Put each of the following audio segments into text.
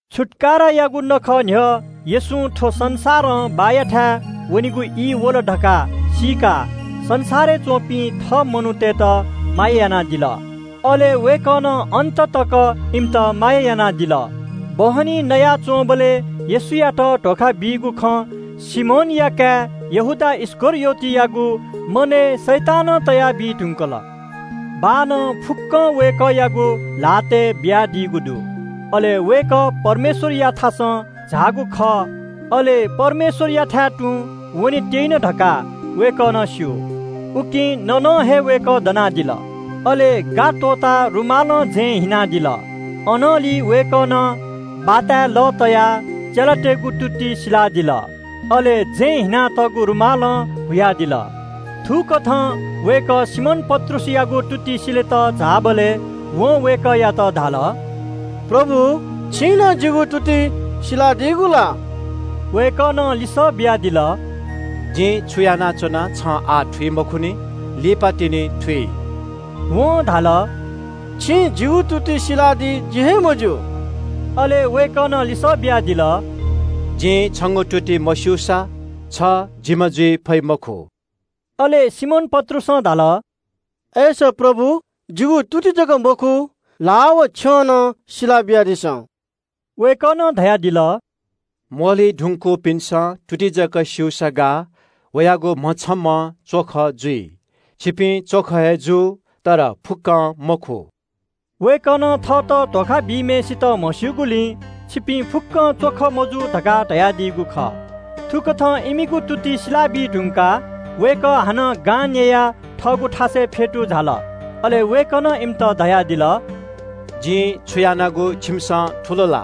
छुत्‍काराया नखः न्‍ह्यः येशूं थ्‍व संसारं बाःयाथाय् वनेगु ई वल धकाः सीकाः संसारय् च्‍वंपिं थः चेलातय्‌त माया यानादिल। वय्‌कलं अन्‍ततक हे इमित माया यानादिल। बहनी नयाच्‍वंबलय् येशूयात धोखा बीगु खँ सिमोनया काय् यहूदा इस्‍करियोतयागु मनय् शैतानं तयाबी धुंकल। बाःनं फुक्‍कं वय्‌कःयागु ल्‍हातय् बियादीगु दु, अले वय्‌कः परमेश्‍वरयाथासं झाःगु खः, अले परमेश्‍वरयाथाय् तुं वने त्‍यइन धकाः वय्‌कलं स्‍यू। उकिं नयेगु त्‍वःताः वय्‌कः दनादिल। अले गा त्‍वःताः रुमालं जँय् हिनादिल। अनंलि वय्‌कलं बाताय् लः तयाः चेलातय्‌गु तुति सिलादिल, अले जँय् हिनातःगु रुमालं हुयादिल। थुकथं वय्‌कः सिमोन पत्रुसयागु तुति सिलेत झाःबलय् वं वय्‌कःयात धाल – “प्रभु, छिं नं जिगु तुति सिलादीगु ला?” वय्‌कलं लिसः बियादिल – “जिं छु यानाच्‍वना छं आः थुइ मखुनि, लिपातिनि थुइ।” वं धाल – “छिं जिगु तुति सिलादी जि हे मज्‍यू।” अले वय्‌कलं लिसः बियादिल – “जिं छंगु तुति मस्‍यूसा छ जिम्‍ह जुइ फइ मखु।” अले सिमोन पत्रुसं धाल – “अय्‌सा प्रभु, जिगु तुति जक मखु, ल्‍हाः व छ्यं नं सिला बियादिसँ।” वय्‌कलं धयादिल – “म्‍वःल्‍हुइ धुंकूपिन्‍सं तुति जक स्‍यूसा गाः, वयागु म्‍हछम्‍हं च्‍वख जुइ। छिपिं च्‍वख हे जू, तर फुक्‍कं मखु।” वय्‌कलं थःत धोखा बीम्‍हय्‌सित म्‍हस्‍यूगुलिं “छिपिं फुक्‍कं च्‍वख मजू” धकाः धयादीगु खः। थुकथं इमिगु तुति सिला बीधुंकाः वय्‌कः हानं गां न्‍ययाः थःगु थासय् फ्‍यतू झाल। अले वय्‌कलं इमित धयादिल – “जिं छु यानागु छिमिसं थुल ला?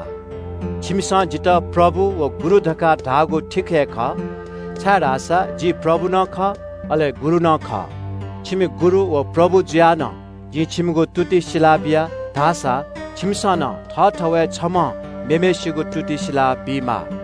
छिमिसं जितः प्रभु व गुरु धकाः धाःगु ठीक हे खः, छाय्‌धाःसा जि प्रभु नं खः, अले गुरु नं खः। छिमि गुरु व प्रभु जुयाः नं जिं छिमिगु तुति सिलाबिया धाःसा छिमिसं नं थःथवय् छम्‍हं मेम्‍हय्‌सिगु तुति सिला बीमाः।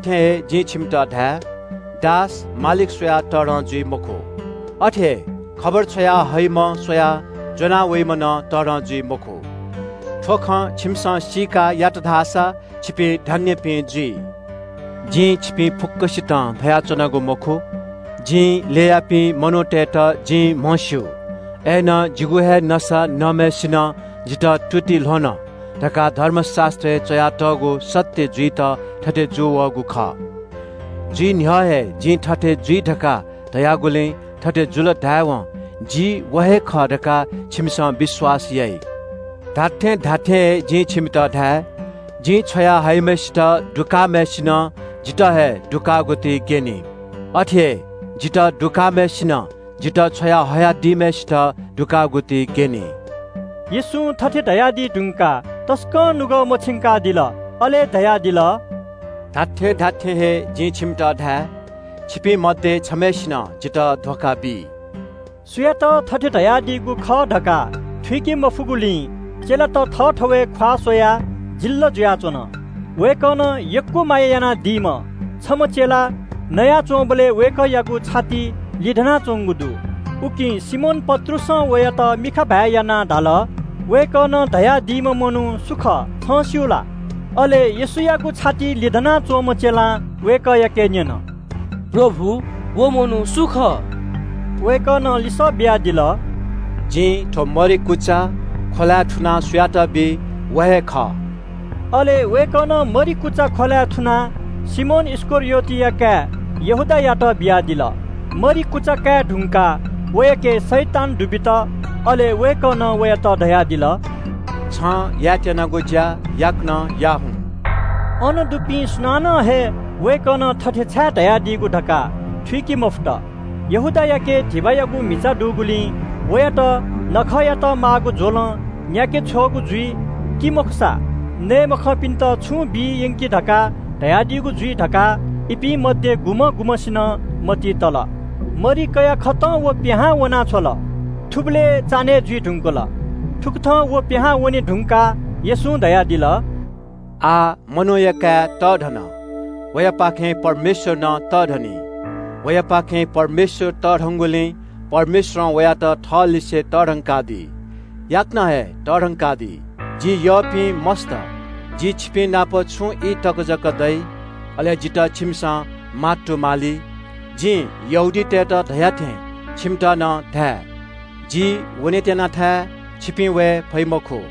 जिं छिमित खःगु खँ धाये – दास मालिक स्‍वयाः तःधं जुइ मखु। अथे हे खबर छ्वया हइम्‍ह स्‍वयाः ज्‍वना वइम्‍ह तःधं जुइ मखु। थ्‍व खँ छिमिसं सीकाः यात धाःसा छिपिं धन्‍यपिं जुइ। “जिं छिपिं फुक्‍कसितं धयाच्‍वनागु मखु। जिं ल्‍ययापिं मनूतय्‌त जिं म्‍हस्‍यू। अय्‌नं ‘जिगु हे नसा नःम्‍हय्‌सिनं जितः प्‍यंकेत तुति ल्‍ह्वन’ धकाः धर्मशास्‍त्रय् च्‍वयातःगु खँ पूवंकेत थथे जूवःगु खः। जुइ न्‍ह्यः हे जिं थथे जुइ धकाः धयागुलिं थथे जुल धाय्‌वं जि व हे खः धकाः छिमिसं विश्‍वास याइ। जिं छिमित खःगु खँ धाये – जिं छ्वया हयाम्‍हय्‌सित दुकाःम्‍हय्‌सिनं जितः हे दुकाःगु ति ग्‍यनी। अथे हे जितः दुकाःम्‍हय्‌सिनं जितः छ्वया हयादीम्‍हय्‌सित दुकाःगु ति ग्‍यनी।” येशूं थथे धयादी धुंकाः तसकं नुगः मछिंकादिल, अले धयादिल – “जिं छिमित खःगु खँ धाये – छिपिं मध्‍ये छम्‍हय्‌सिनं जितः धोखा बी।” सुयात थथे धयादीगु खः धकाः थुइके मफुगुलिं चेलात थःथवय् ख्‍वाः स्‍वयाः वातां जुयाच्‍वन। वय्‌कलं यक्‍व माया यानादीम्‍ह छम्‍ह चेला नयाच्‍वंबलय् वय्‌कःयागु छातिइ लिधनाच्‍वंगु दु। उकिं सिमोन पत्रुसं वयात मिखा भाय् यानाः धाल – “वय्‌कलं धयादीम्‍ह मनू सु खः, छं स्‍यू ला?” अले येशूयागु छातिइ लिधना च्‍वंम्‍ह चेलां वय्‌कःयाके न्‍यन “प्रभु, व मनू सु खः?” वय्‌कलं लिसः बियादिल – “जिं थ्‍व मरि कुचा ख्‍वलाय् थुनाः सुयात बी, व हे खः।” अले वय्‌कलं मरि कुचा ख्‍वलाय् थुनाः सिमोन इस्‍करियोतया काय् यहूदायात बियादिल। मरि कुचा काये धुंकाः वयाके शैतान दुबित। अले येशूं वयात धयादिल – “छं यायेत्‍यनागु ज्‍या याकनं याः हुँ।” अन दुपिं सुनानं हे वय्‌कलं थथे छाय् धयादीगु धकाः थुइके मफुत। यहूदायाके धिबायागु म्‍हिचा दुगुलिं वयात नखःयात माःगु ज्‍वलं न्‍याके छ्वःगु जुइ, कि मखुसा नये मखंपिन्‍त छुं बी यंकि धकाः धयादीगु जुइ धकाः इपिं मध्‍ये गुम्‍ह गुम्‍हय्‌सिनं मतिइ तल। मरि कयाकथं यहूदा पिहां वना छ्वल। थुबलय् चान्‍हय् जुइ धुंकल। यहूदा पिहां वने धुंकाः येशूं धयादिल – “आः मनूया काय् तःधन। वयापाखें परमेश्‍वर नं तःधनी। वयापाखें परमेश्‍वर तःधनिगुलिं परमेश्‍वरं वयात थःलिसे तःधंकादी, याकनं हे तःधंकादी। जि यःपिं मस्‍त, जि छिपिंनाप छुं ई तक जक दइ। अले जितः छिमिसं मात्तुमाली। जिं यहूदीतय् नायःतय्‌त धया थें छिमित नं धाये – ‘जि वनेत्‍यनाथाय् छिपिं वये फइ मखु।’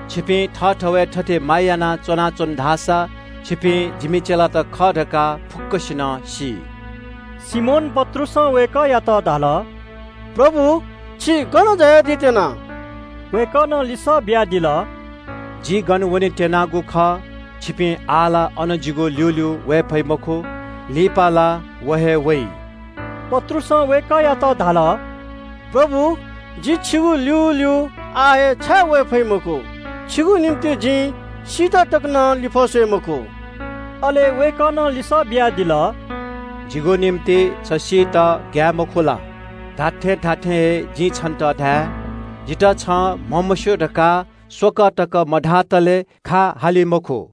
छिपिं थःथवय् थथे माया याना च्‍वनाच्‍वन धाःसा छिपिं जिमि चेलात खः धकाः फुक्‍कसिनं सी।” सिमोन पत्रुसं वय्‌कःयात धाल – “प्रभु, छि गन झायादी त्‍यना?” वय्‌कलं लिसः बियादिल – “जि गन वनेत्‍यनागु खः छ आः ला अन जिगु ल्‍यूल्‍यू वये फइ मखु, लिपा ला व हे वइ।” पत्रुसं वय्‌कःयात धाल – “प्रभु, जि छिगु ल्‍यूल्‍यू आः हे छाय् वये फइ मखु? छिगु निंतिं जिं सीत तक नं लिफः स्‍वये मखु।” अले वय्‌कलं लिसः बियादिल – “छु जिगु निंतिं छ सीत तकं ग्‍याये मखु ला? जिं छन्‍त खःगु खँ धाये – जितः छं म्‍हमस्‍यू धकाः स्‍वकः तक मधातले खा हाली मखु।”